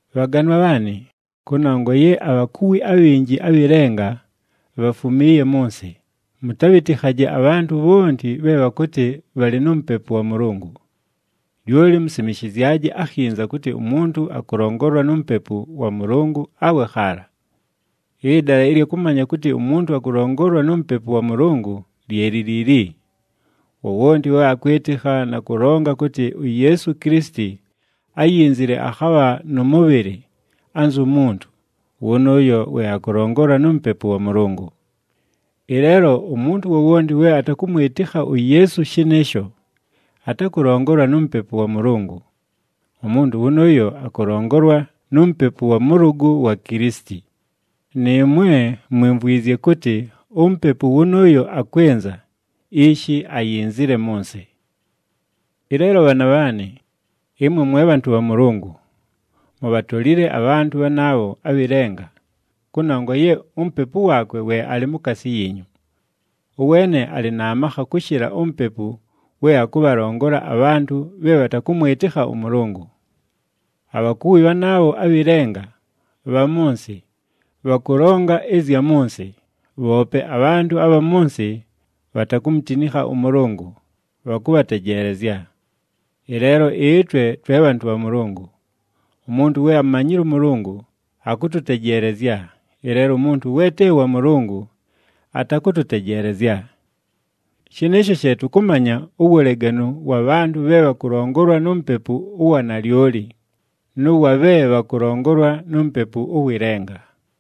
Bhaganwa bhaanɨ, kʉnongwa ye abhakuwi abhinji abhɨ lenga bhafumiiye mʉ nsɨ, mʉtabhɨtɨkhaje abhantʉ bhonti bhe bhakʉtɨ bhalɨ nu Mupepu wa Mʉlʉngʉ. Lyoli musimishizyaje akhinza kʉtɨ umuntu akʉlongolwa nu Mupepu wa Mʉlʉngʉ awe khaala. Ɨdala ɨlya kʉmanya kʉtɨ umuntu akʉlongolwa nu Mupepu wa Mʉlʉngʉ lye li liili: wowonti we akwɨtɨkha na kʉlonga kʉtɨ uYeesu Kilisiti, áyinzile akhabha nʉ mʉbhɨlɨ anzu muntu, wʉnʉʉyo we akʉlongolwa nu Mupepu wa Mʉlʉngʉ. Ɨleelo umuntu wowonti we atakʉmwɨtɨkha uYeesu shɨnɨɨsho, atakʉlongolwa nu Mupepu wa Mʉlʉngʉ. Umuntu wʉnʉʉyo akʉlongolwa nu mupepu wa mʉlʉgʉ wa Kilisiti. Nɨɨmwe, mwimvwizye kʉtɨ umupepu wʉnʉʉyo akwɨnza, ishi ayinzile mʉ nsɨ. Ɨleelo bhaana bhaanɨ, ɨmwe mwe bhantʉ bha Mʉlʉngʉ, mubhatolile abhantʉ bhanaabho abhɨ lenga, kʉnongwa ye uMupepu waakwe we alɨ mukaasi yiinyu. Ʉweene alɨ na makha kʉshɨla umupepu we akʉbhalongola abhantʉ bhe bhatakʉmwɨtɨkha ʉMʉlʉngʉ. Abhakuwi bhanaabho abhɨ lenga, bha mʉ nsɨ, bhakʉlonga ɨzya mʉ nsɨ, bhoope abhantʉ abha mʉ nsɨ bhatakumutinikha ʉMʉlʉngʉ, bhakʉbhatejeelezya. Ɨleelo ɨtwe twe bhantʉ bha Mʉlʉngʉ. Umuntu we amumanyile ʉMʉlʉngʉ, akʉtʉtejeelezya, ɨleelo umuntu we te wa Mʉlʉngʉ, atakʉtʉtejeelezya. Shɨnɨɨsho she tʉkʉmanya uwuleganu wa bhantʉ bhe bhakʉlongolwa nu Mupepu ʉwa wanalyoli, nʉ wa bhe bhakʉlongolwa nu mupepu ʉwɨ lenga.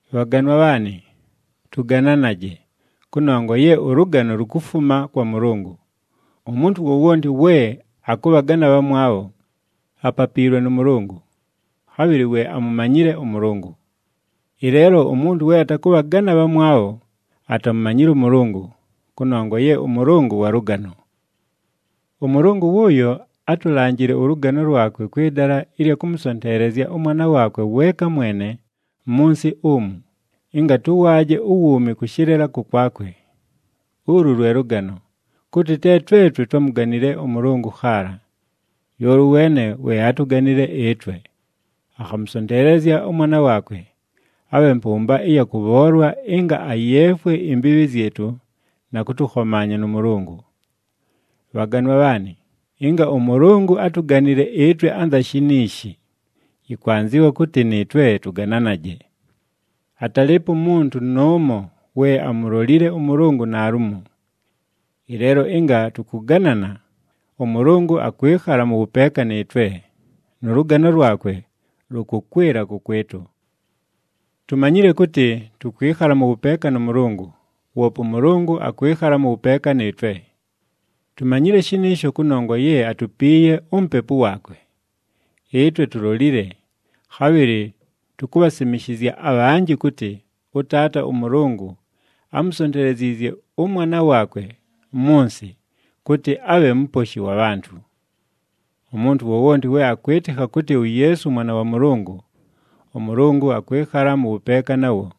Bhaganwa bhaanɨ, tʉgananaje, kʉnongwa ye ʉlʉgano lukufuma kwa Mʉlʉngʉ. Umuntu wowonti we akʉbhagana abhamwabho, apapiilwe nʉ Mʉlʉngʉ, khabhɨlɨ we amumanyile ʉMʉlʉngʉ. Ɨleelo umuntu we atakʉbhagana abhamwabho, atamumanyile ʉMʉlʉngʉ, kʉnongwa ye ʉMʉlʉngʉ wa lʉgano. ɄMʉlʉngʉ wʉʉyo átulanjile ʉlʉgano lwakwe kwɨ dala ɨlya kʉmʉsonteelezya ʉMwana waakwe weeka mwene mʉ nsɨ umu, ɨnga tʉwaaje uwuumi kʉshɨlɨla kʉkwakwe. Ulu lwe lʉgano, kʉtɨ te twetwe twámuganile ʉMʉlʉngʉ khaala! Lyoli ʉweene we átuganile ɨtwe, akhamʉsonteelezya ʉMwana waakwe, abhe mpʉmba ɨya kʉbhoolwa ɨnga ayeefwe imbiibhi zyɨtʉ na kʉtʉkhomaanya nʉ Mʉlʉngʉ. Bhaganwa bhaanɨ, ɨnga ʉMʉlʉngʉ átuganile ɨtwe anza shiniishi, yɨkwanzɨwa kʉtɨ nɨɨtwe tʉgananaje. Atalɨɨpo umuntu nʉʉmo we amulolile ʉMʉlʉngʉ naalumo. Ɨleelo ɨnga tʉkʉganana, ʉMʉlʉngʉ akwɨkhala mʉ wʉpeeka nɨɨtwe, nʉ lʉgano lwakwe lʉkʉkwɨla kʉkwɨtʉ. Tumanyile kʉtɨ tʉkwɨkhala mʉ wʉpeeka nʉ Mʉlʉngʉ, woope ʉMʉlʉngʉ akwɨkhala mʉ wʉpeeka nɨɨtwe. Tumanyile shɨnɨɨsho kʉnongwa ye atupiiye uMupepu waakwe. Ɨtwe tulolile, khabhɨlɨ tukubhasimishizya abhanjɨ kʉtɨ ʉTaata ʉMʉlʉngʉ ámusonteleziizye ʉMwana waakwe mʉ nsɨ, kʉtɨ abhe Muposhi wa bhantʉ. Umuntu wowonti we akwɨtɨkha kʉtɨ uYeesu Mwana wa Mʉlʉngʉ, ʉMʉlʉngʉ akwɨkhala mʉ wʉpeeka nawo,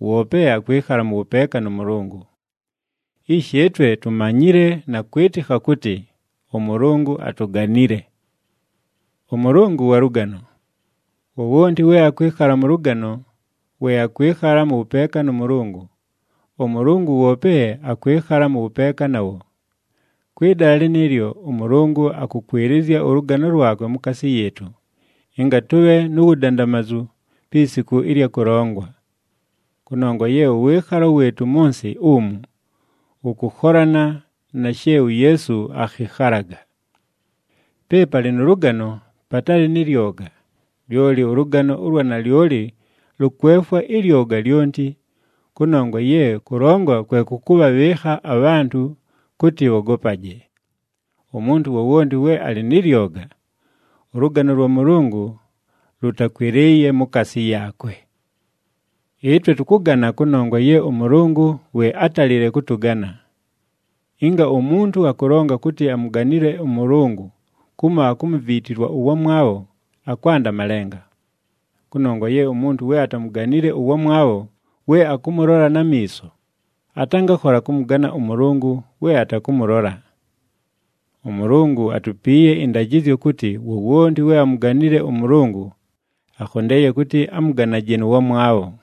woope akwɨkhala mʉ wʉpeeka nʉ Mʉlʉngʉ. Ishi, ɨtwe tumanyile na kwɨtɨkha kʉtɨ ʉMʉlʉngʉ atuganile. ɄMʉlʉngʉ wa lʉgano. Wowonti we akwɨkhala mʉ lʉgano, we akwɨkhala mʉ wʉpeeka nʉ Mʉlʉngʉ, ʉMʉlʉngʉ woope akwɨkhala mʉ wʉpeeka nawo. Kwɨ dala lɨnɨɨlyo, ʉMʉlʉngʉ akʉkwɨlɨzya ʉlʉgano lwakwe mukaasi yɨɨtʉ, ɨnga tʉbhe nu wudandamazu pi siku ɨlya kʉlongwa. Kʉnongwa ye ʉwɨɨkhalo wɨɨtʉ mʉ nsɨ umu, wʉkʉkholana na she uYeesu akhɨkhalaga. Pe palɨ nʉ lʉgano patalɨ nɨ lyoga, lyoli ʉlʉgano ʉlwa nalyoli lʉkwefwa ɨlyoga lyonti, kʉnongwa ye kʉlongwa kwe kʉkʉbhabhɨɨkha abhantʉ kʉtɨ bhogopaje. Umuntu wowonti we alɨ nɨ lyoga, ʉlʉgano lwa Mʉlʉngʉ lʉtakwɨlɨɨye mukaasi yaakwe. Ɨtwe tʉkʉgana kʉnongwa ye ʉMʉlʉngʉ we átalile kʉtʉgana. Ɨnga umuntu akʉlonga kʉtɨ amuganile ʉMʉlʉngʉ kumo akumuviitilwa ʉwamwabho, akwanda malenga. Kʉnongwa ye umuntu we atamuganile ʉwamwabho we akʉmʉlola na miiso, atangakhola kʉmʉgana ʉMʉlʉngʉ we atakʉmʉlola. ɄMʉlʉngʉ atupiiye ɨndajɨzyo kʉtɨ wowonti we amuganile ʉMʉlʉngʉ, akhondeeye kʉtɨ amʉganaje nʉ wamwabho.